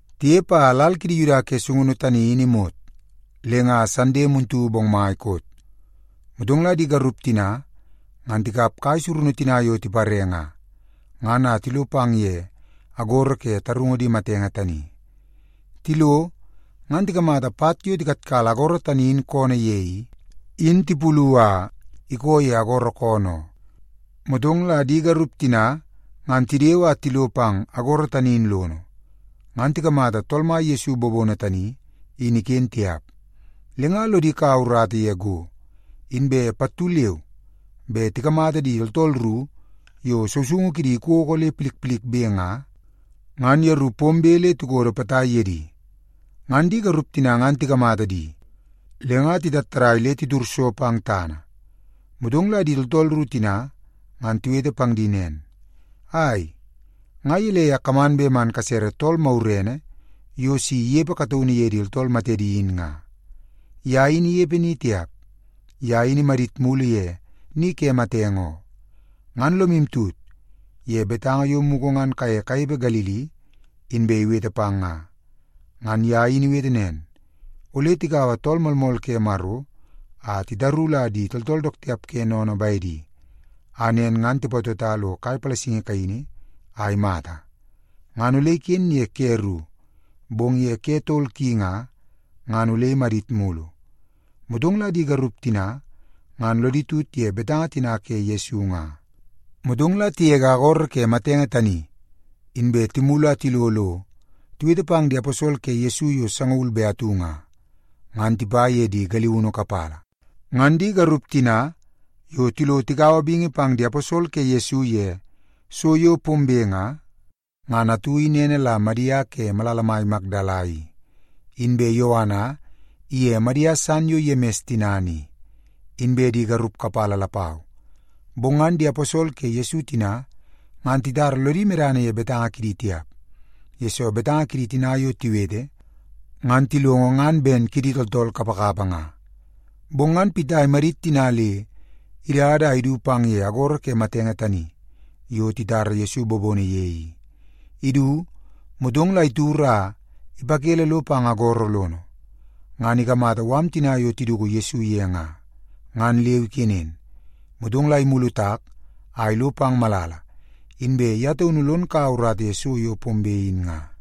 Tinepe a lal kidi Yuda ke sungunu tani in imot, le nga Sande muntu bongmai koot. Motong la di garup tina ngan tikap kai surunu tina yo tipare nga, ngan a tilo pang ye agoro ke tarungu di matenge tani. Tilo, ngan tikamata pat yo tikatkala agoro tani in koonoo ye i, in tipulu a ikoo ye agoro koonoo oo. Motong la di garup tina ngan tidewe a tilo pang agoro tani in lono, ngan tikamata Tool Mai Yesu bobono tani in iken tiap. Le nga lodi kaua urata ye go, inbe pattu leu be tikamata di tooltool ru yo sousoungu kidi ikoko le milmilbe nga, ngan yeru pombe le tikodo potai ye di. Ngan di garup tina ngan tikamata di, le nga titattadai le titud so pang tana. Motong la di tooltool ru tina ngan tiwete pang di nen, “Ai, nga gelei a kaman bet man kasere tool magurene yo si inepe kataunu ye di tooltool matedi in nga? Ye in inepe ni tiap. Ye in imadit mulu ye ni ke matenge oo. Ngan lomu tut ye betanga yo mugu ngan kaye kanepe Galili inbe iwete pang nga. Ngan ye in iwete nen, ‘Ole tikaua Tool Moolmool ke Maro a titaru la di tooltool dook tiap ke sennene bedi, a nen ngan tipatota lo kai palasingi kaini a imata. Ngan ole iken ye ke ru, bong ye ke tol ki nga, ngan ole amadit mulu.’” Motong la di garup tina ngan lodi tut ye betanga tina ke Yesu nga. Motong la tigege agoro ke matenge tani, inbe timulu a tilo lo tiwete pang di aposol ke Yesu yo sangaul be atu nga, ngan tipa ye di galiunu kapala. Ngan di garup tina yo tilo tikaua bingi pang di aposol ke Yesu ye so yo pombe nga, ngan atu in ene la Madia ke malala mai Makdala i, inbe Yoana iye Madia san yo Yemis tinana i, inbe di garup kapala lapau. Bong ngan di aposol ke Yesu tina ngan titara lodi medana ye betanga kidi tiap, yesoo betanga kidi tina yo tiwete, ngan tilongo ngan ben kidi tooltool kapakapa nga. Bong ngan Pita imadit tina le idada a idu pang ye agoro ke matenge tani yo titara Yesu bobono ye i. Idu, motong la itud a ipakele lo pang agoro lono, ngan ikamata mala tina yo tiduku Yesu ye nga, ngan leu ikenen. Motong la imulu tak a ilo pang malala, inbe ye taunu lon kaua urata ye so yo pombe in nga.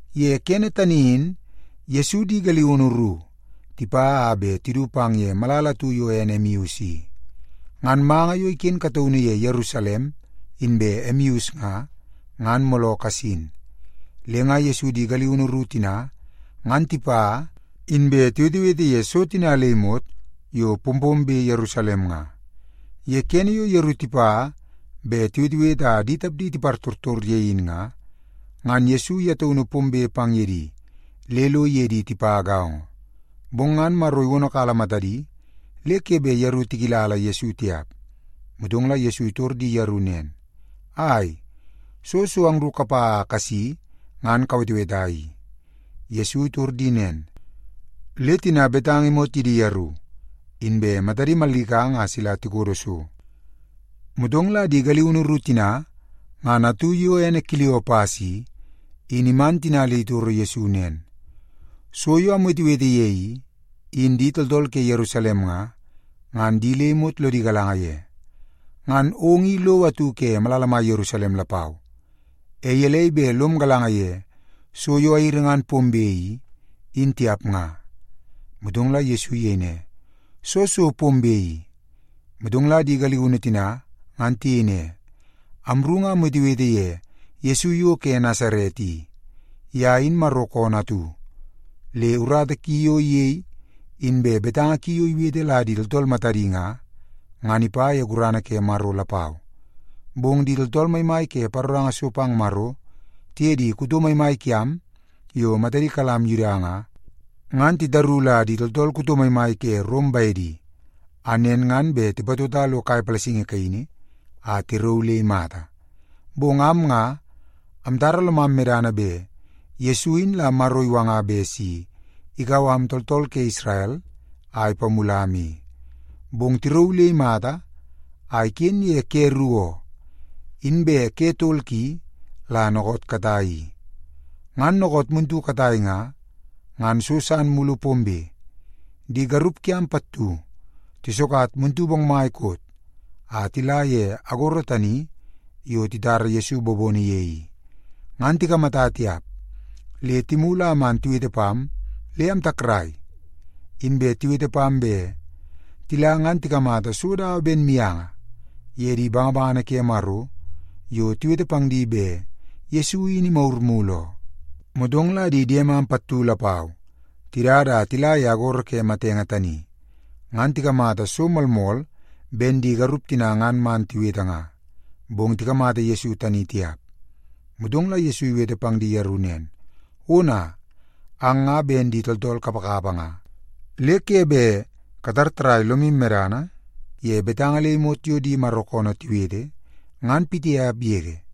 Ye kene tani in Yesu di galiunu ru tipa a bet tidu pang ye malala atu yo ene Emeus i. Ngan manga yo iken kataunu ye Yerusalem inbe Emeus nga, ngan mooloo kasin. Le nga Yesu di galiunu ru tina ngan tipa, inbe tiwetewete ye so tina le imot yo pompombe Yerusalem nga. Ye kene yo yeru tipa bet tiwetewete a di tapdi tipartortor ye in nga, ngan Yesu ye taunu pombe pang ye di le lo iye di tipa gaongo. Bong ngan Maro iwonokala matadi, le ke bet yeru tikilala Yesu tiap. Motong la Yesu itor di yeru nen, “Ai, soo so angru kapa a kasi ngan kaweteweta i?” Yesu itor di nen, le tina betanga imot ye di yeru, inbe matadi mallikanga a sila tikodo so. Motong la di galiunu ru tina ngan atu yo ene Kiliopas i, in iman tina le itoro Yesu nen, “So yo amwetewete ye i, in di tooltool ke Yerusalem nga, ngan di le imot lodi galanga ye. Ngan ong i lowo atu ke malala mai Yerusalem lapau, e gelei bet lom galanga ye so yo airi ngan pombe i, in tiap nga?” Motong la Yesu iyei ne, “Soo so pombe i?” Motong la di galiunu tina ngan tiyei ne, “Amru nga amwetewete ye Yesu yo ke Nasaret i. Ye in Maro koonoo atu, le urata ki yo iyei inbe betanga ki yo iwete la di tooltool matadi nga, ngan ipa ye gurana ke Maro lapau. Bong di tooltool maimai ke paroranga so pang Maro tiye di kuto maimai kiam yo matadi kalam Yuda nga, ngan titaru la di tooltool kuto maimai ke Rom bedi, a nen ngan bet tipatota lo kai palasingi kaini a tirauu le imata. Bong am nga, amtara lomam medana bet Yesu in la Maro iwanga bet si ikau am tooltool ke Isrel a ipamulam i. Bong tirauu le imata a iken ye ke ru oo, inbe ke tol ki la dookoot katai i. Ngan dookoot muntu katai nga, ngan so san mulu pombe. Di garup kiam pattu tisokat muntu bongmai koot a tila ye agoro tani yo titara Yesu bobono ye i, ngan tikamata tiap le timulu a man tiwete pam le amtakrai. Inbe tiwete pam bet tila ngan tikamata so dawa ben mianga ye di bangabangana ke Maro yo tiwete pang di bet Yesu in imagur mulu oo. Motong la di diemam pattu lapau tidada a tila ye agoro ke matenge tani, ngan tikamata so moolmool ben di garup tina ngan man tiwete nga, bong tikamata Yesu tani tiap.” Motong la Yesu iwete pang di yeru nen, “Ona, ang nga ben di tooltool kapakapa nga, le ke bet katar tarrai lomu medana ye betanga le imot yo di Maro koonoo tiwete, ngan pitiap yege.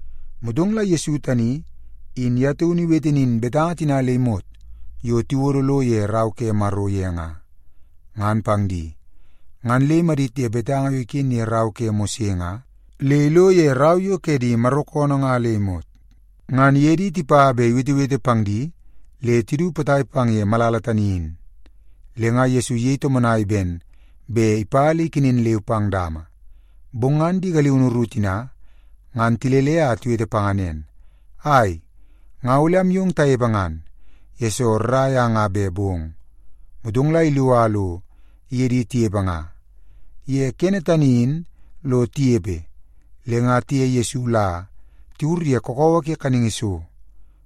Motong la Yesu tani in ye taunu iwete nin betanga tina le imot yo tiwodo lo ye Rau ke Maro ye nga, ngan pang di. Ngan le imadit ye betanga yo iken ye rau ke Mose nga, le ilo ye rau yo ke di Maro koonoo nga le imot. Ngan iye di tipa bet iwetewete pang di le tidu potai pang ye malala tani in, le nga Yesu iyei tomonai ben bet ipa le ikenen leu pang dama. Bong ngan di galiunu ru tina, ngan tilele a tiwete panga nen, “Ai, nga ole amyong tanepe ngan, yesoo rrai a nga bet bong.” Motong la ilo a lo iye di tinepe nga. Ye kene tani in lo tinepe, le nga tiye Yesu la tiwur ye kakawa ke kaningi so,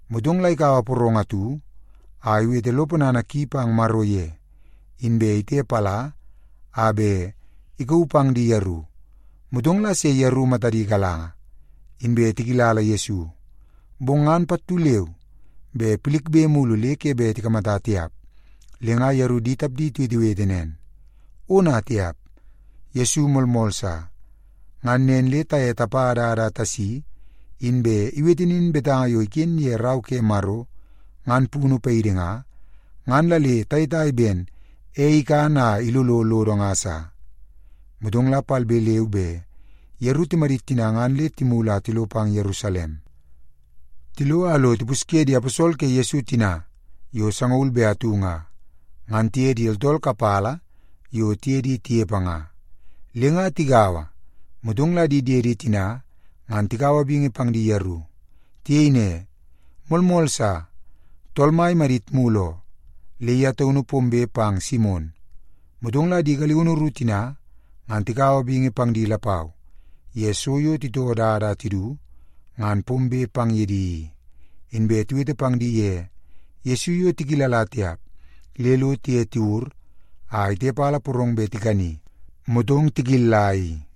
motong la ikaua porong atu a iwete lo ponana ki pang Maro ye, inbe itepala a bet ikauu pang di yeru. Motong la se yeru matadi galanga, inbe tikilala Yesu. Bong ngan pattu leu be pilikbe mulu le ke bet tikamata tiap. Le nga yeru di tapdi tiwetewete nen, “Ona tiap! Yesu moolmool sa! Ngan nen le taye tapa dada a tasi, inbe iwete nin betanga yo iken ye Rau ke Maro ngan punu paidi nga, ngan la le tayetai ben ei ikan a ilolo lodo nga sa.” Motong la palbe leu be yeru timadit tina ngan le timulu a tilo pang Yerusalem. Tilo a lo tipusye di aposol ke Yesu tina yo sangaul be atu nga, ngan tiye di tooltool kapala yo tiye di tinepe nga. Le nga tigaua, motong la di diedi tina ngan tikaua bingi pang di yeru. Tiyei ne, “Moolmool sa! Tool Mai imadit mulu oo, le ye taunu pombe pang Simon.” Motong la di galiunu ru tina ngan tikaua bingi pang di lapau ye so yo titoo dada a tidu ngan pombe pang ye di i. Inbe tiwete pang di ye Yesu yo tikilla tiap le lo tiye tiwur a itepala porong bet tikani, motong tikilla i.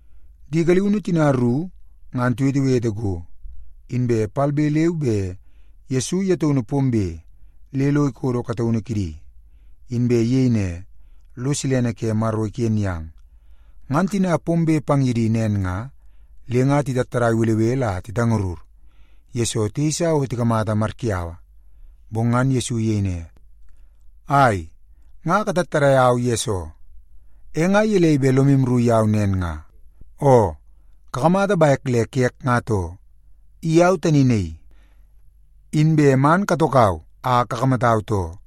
Di galiunu tina ru ngan tiwetewete go, inbe palbe leu be Yesu ye taunu pombe le lo ikodo kataunu kidi, inbe iyei ne, “Lo silene ke Maro iken yang.” Ngan tina pombe pang ye di nen nga, le nga titattadai belebele a titangarur, yesoo tiyeisa o tikamata mariyaua. Bong ngan Yesu iyei ne, “Ai, nga katattadai au yesoo? E nga gelei bet lomu rru yau nen nga? Oo, kakamata bek le kek, nga too. I au tani naii! Inbe man katokau a kakamatau, too.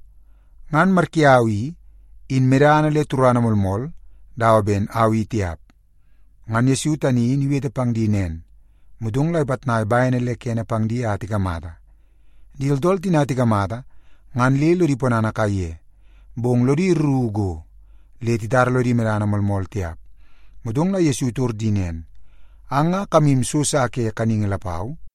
Ngan mariyaua i, in medana le turana moolmool dawa ben au i tiap.” Ngan Yesu tani in iwete pang di nen, motong la ipitnai bene le kene pang di a tikamata. Di tooltool tina tikamata ngan le lodi ponana kaiye, bong lodi rru go le titara lodi medana moolmool tiap. Motong la Yesu itor di nen, “Ang nga kamu so sa ke kaningi lapau?”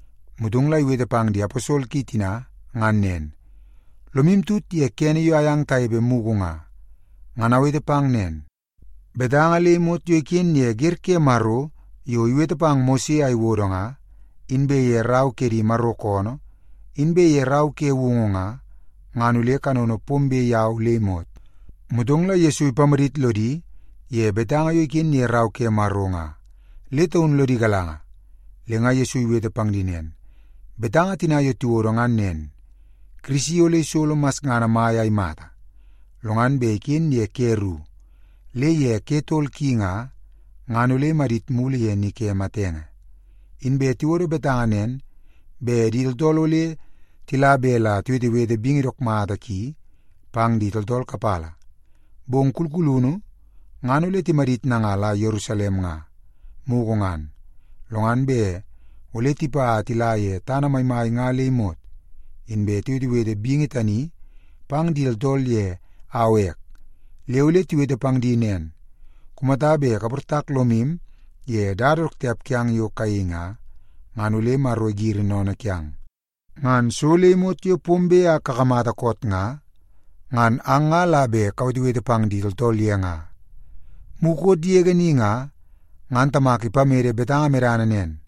Motong la iwete pang di aposol ki tina ngan nen, “Lomu tut ye kene yo ayang tanepe mugu nga, ngan awete pang nen. Betanga le imot yo iken ye wer ke Maro yo iwete pang Mose a iwodo nga, inbe ye rau ke di Maro koonoo, inbe ye Rau ke Woungu nga, ngan ole kanono pombe yau le imot.” Motong la Yesu ipamadit lodi ye betanga yo iken ye Rau ke Maro nga, le taun lodi galanga. Le nga Yesu iwete pang di nen, “Betanga tina yo tiwodo ngan nen: Kirisi ole isolo masngana mai a imata, lo ngan bet iken ye ke ru, le ye ke tol ki nga, ngan ole imadit mulu ye ni ke matenge. Inbe tiwodo betanga nen, bet di tooltool ole tila bet la tiwetewete bingi dook mata ki pang di tooltool kapala. Bong kulkulunu ngan ole timadit nanga la Yerusalem nga, mugu ngan, lo ngan bet ole tipa a tila ye tana maimai nga le imot, inbe tiwetewete bingi tani pang di tooltool ye au ek. Le ole tiwete pang di nen, ‘Kumata bet kaportak lomu ye dada dook tiap kiang yo kayei nga, ngan ole Maro igiri sennene kiang.’ Ngan so le imot yo pombe a kakamata koot nga, ngan ang nga la bet la kawetewete pang di tooltool ye nga. Mukot yege ni nga, ngan Tamak ipamede betanga medana nen,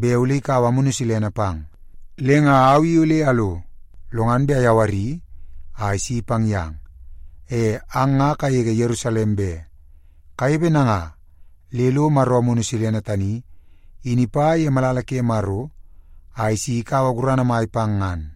bet ole ikaua Amunu Silene pang. Le nga au i ole alo, lo ngan bet ayawari a isi pang yang. E ang nga kagege Yerusalem be, kanepe nanga le lo Maro Amunu Silene tani in ipa ye malala ke Maro a isi ikaua gurana mai pang ngan.”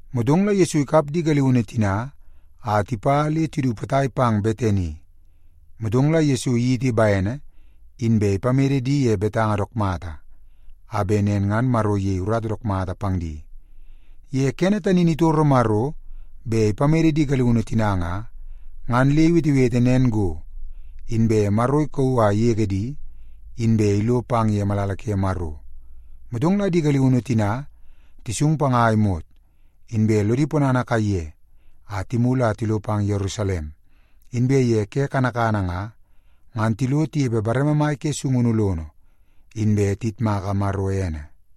Motong la Yesu ikap di galiunu tina a tipa le tidu potai pang Betani. Motong la Yesu iyiti bene, inbe ipamede di ye betanga dook mata, a bet nen ngan Maro iyei urata dook mata pang di. Ye kene tani in itoro Maro bet ipamede di galiunu tina nga, ngan le iwetewete nen go, inbe Maro ikauu a igege di, inbe ilo pang ye malala ke Maro. Motong la di galiunu tina tisung panga a imot, inbe lodi ponana kaiye a timulu a tilo pang Yerusalem. Inbe ye ke kanakana nga, ngan tilo tinepe bareme mai ke sungunu lono, inbe tiyitmaka Maro ene.